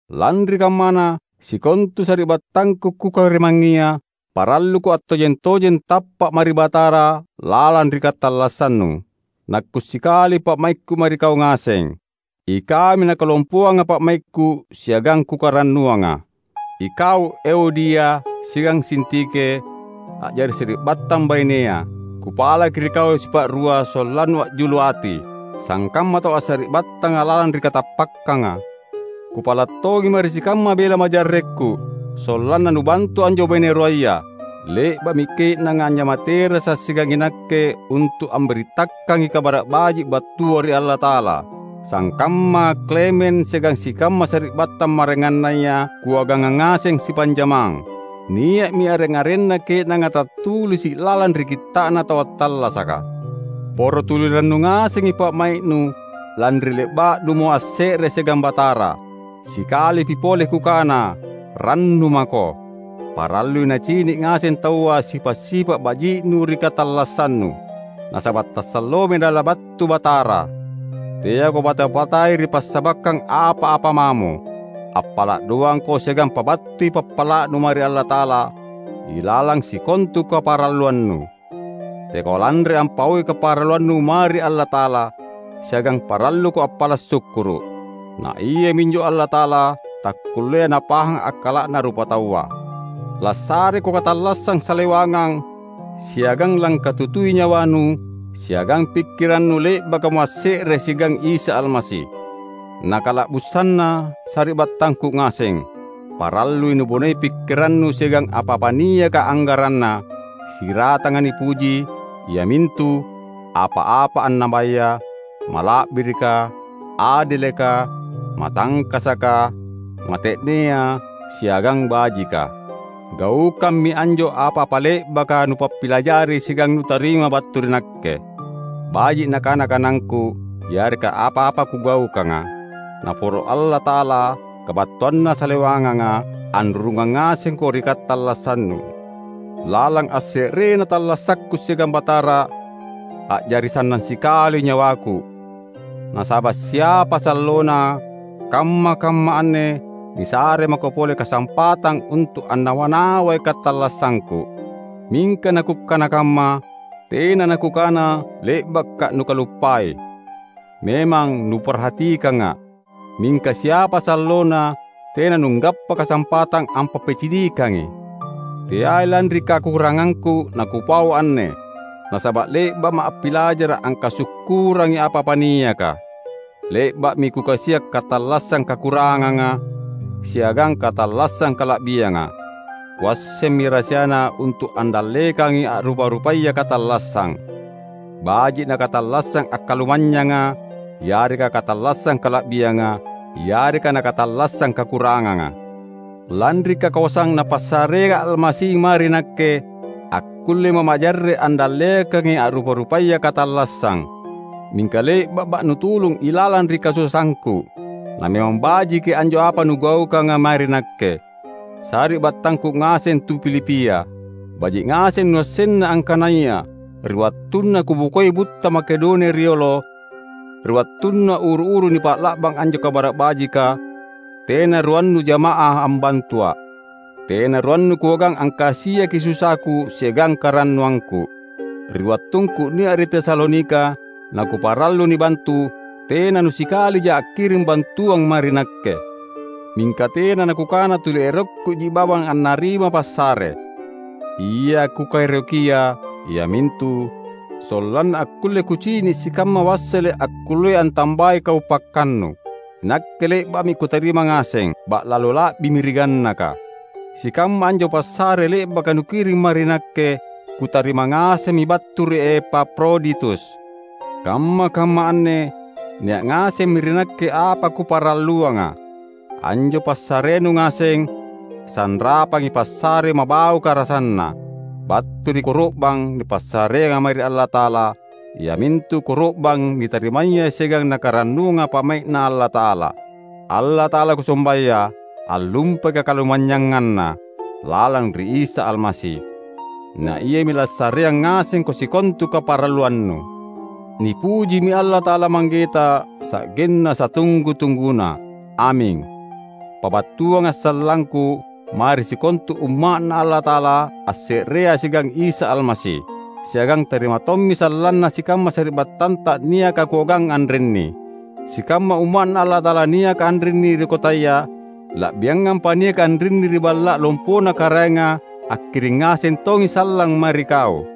Lanri kammana, sikontu sari’battangku kukarimangngia, paralluko attojeng-tojeng tappa’ mae ri Batara lalang ri katallassannu. Nakku’ sikali pa’maikku mae ri kau ngaseng! Ikaumi nakalompoanga pa’maikku siagang kukarannuanga. Ikau Euodia siagang Sintike, a’jari sari’battang bainea! Kupalaki ri kau sipa’rua sollannu a’julu ati, sangkamma tau assari’battanga lalang ri katappakkanga. Kupala’ tongi mae ri sikamma bela majarrekku, sollanna nubantu anjo baine ruaya. Le’ba’mi ke’nanga anjama terasa’ siagang inakke untu’ ambirittakangi Kabara’ Baji’ battua ri Allata’ala; sangkamma Klemen siagang sikamma sari’battang maraengannaya kuaganga ngaseng sipanjamang. Nia’mi areng-arenna ke’nanga tattulisi’ lalang ri Kitta’na Tau Attallasaka. Poro tuli rannu ngasengi pa’mai’nu, lanri le’ba’numo asse’re siagang Batara. Sikalipi pole kukana: rannu mako! Parallui nacini’ ngaseng taua sipa’-sipa’ baji’nu ri katallassannu. Nasaba’ tasalloami Nalabattu Batara. Teako bata-batai ri passabakkang apa-apa mamo. Appala’ doangko siagang pabattui pappala’nu mae ri Allata’ala, ilalang sikontu kaparalluannu. Teako lanre ampaui kaparalluannu mae ri Allata’ala; siagang paralluko appala’ sukkuru’. Na Iaminjo Allata’ala takkullea napahang akkala’na rupataua, lassareko katallassang salewangang; siagang langkatutui nyawanu siagang pikkirannu le’bakamo asse’re siagang Isa Almasi. Na kala’busanna, sari’battangku ngaseng, parallui nubonei pikkirannu siagang apa-apa niaka anggaranna, siratanga nipuji, iamintu: apa-apa annabaya, mala’birika, adeleka, matangkasaka, mate’nea, siagang bajika. Gaukammi anjo apa-apa le’baka nupappilajari siagang nutarima battu ri nakke; baji’ nakana-kanangku, yareka apa-apa kugaukanga. Naporo Allata’ala, kabattuanna salewanganga, anrurungang ngasengko ri katallassannu. Lalang asse’rena tallasakku siagang Batara, a’jari sannang sikali nyawaku; nasaba’ siapa sallona, kamma-kamma anne nisare mako pole kasampatang untu’ annawa-nawai katallassangku. Mingka nakukkana kamma, tena nakukana le’baka’ nukaluppai; memang nuparhatikanga’, mingka siapa sallona tena nunggappa kasampatang ampappicinikangi. Teai lanri kakurangangku nakupau anne; nasaba’ le’ba’ma’ appilajara’ angkasukkurangi apa-apa niaka. Le’ba’mi kukasia’ katallassang kakuranganga, siagang katallassang kala’bianga. Kuassemmi rahasiana untu’ andallekangi a’rupa-rupaya katallassang; baji’ nakatallassang akkalumanynyanga yareka katallassang kala’bianga, yareka nakatallassang kakuranganga. Lanri kakoasang Napassareanga Almasi mae ri nakke, akkullema’ majarre’ andallekangi a’rupa-rupaya katallassang. Mingka le’ba’ma’ nutulung ilalang ri kasusaangku; na memang bajiki anjo apa nugaukanga mae ri nakke. Sari’battangku ngaseng tu Filipia! Baji’ ngaseng nuassenna, angkanaya ri wattunna kubokoi butta Makedonia riolo, ri wattunna uru-uru nipa’la’bang anjo Kabara’ Bajika, tena ruannu jama’ah ambantua’; tena ruannu kuagang angkasiaki susaku siagang karannuangku. Ri wattungku nia’ ri Tesalonika nakuparallu nibantu, tena nusikalija akkiring bantuang mae ri nakke. Mingka tena nakukana tuli erokkuji bawang annarima passare. Ia kukaerokia, iamintu: sollanna akkulle kucini’ sikamma wassele’ akkullea antambai kaupakkannu. Inakke le’ba’mi kutarima ngaseng — ba’lalo la’bimi ri gannaka! Sikamma anjo passare le’baka nukiring mae ri nakke, kutarima ngasemmi battu ri Epafroditus. Kamma-kamma anne nia’ ngasemmi ri nakke apa kukaparalluanga. Anjo passarenu ngaseng, sanrapangi passare mabauka rasanna, battu ri koro’bang nipassareanga mae ri Allata’ala iamintu koro’bang nitarimaya siagang Nakarannuanga pa’mai’Na Allata’ala. Allata’ala kusombaya, allumpai kakalumanynyanganNa lalang ri Isa Almasi; na Iami lassareang ngasengko sikontu kaparalluannu. Nipujimi Allata’ala Manggeta sa’genna satunggu-tungguna. Aming! Pabattuanga’ sallangku mae ri sikontu Umma’Na Allata’ala asse’rea siagang Isa Almasi. Siagang tarima tommi sallanna sikamma sari’battanta niaka kuagang anrinni. Sikamma Umma’Na Allata’ala niaka anrinni ri kotaya, la’biangampa niaka anrinni ri balla’ lompona karaenga akkiring ngaseng tongi sallang mae ri kau.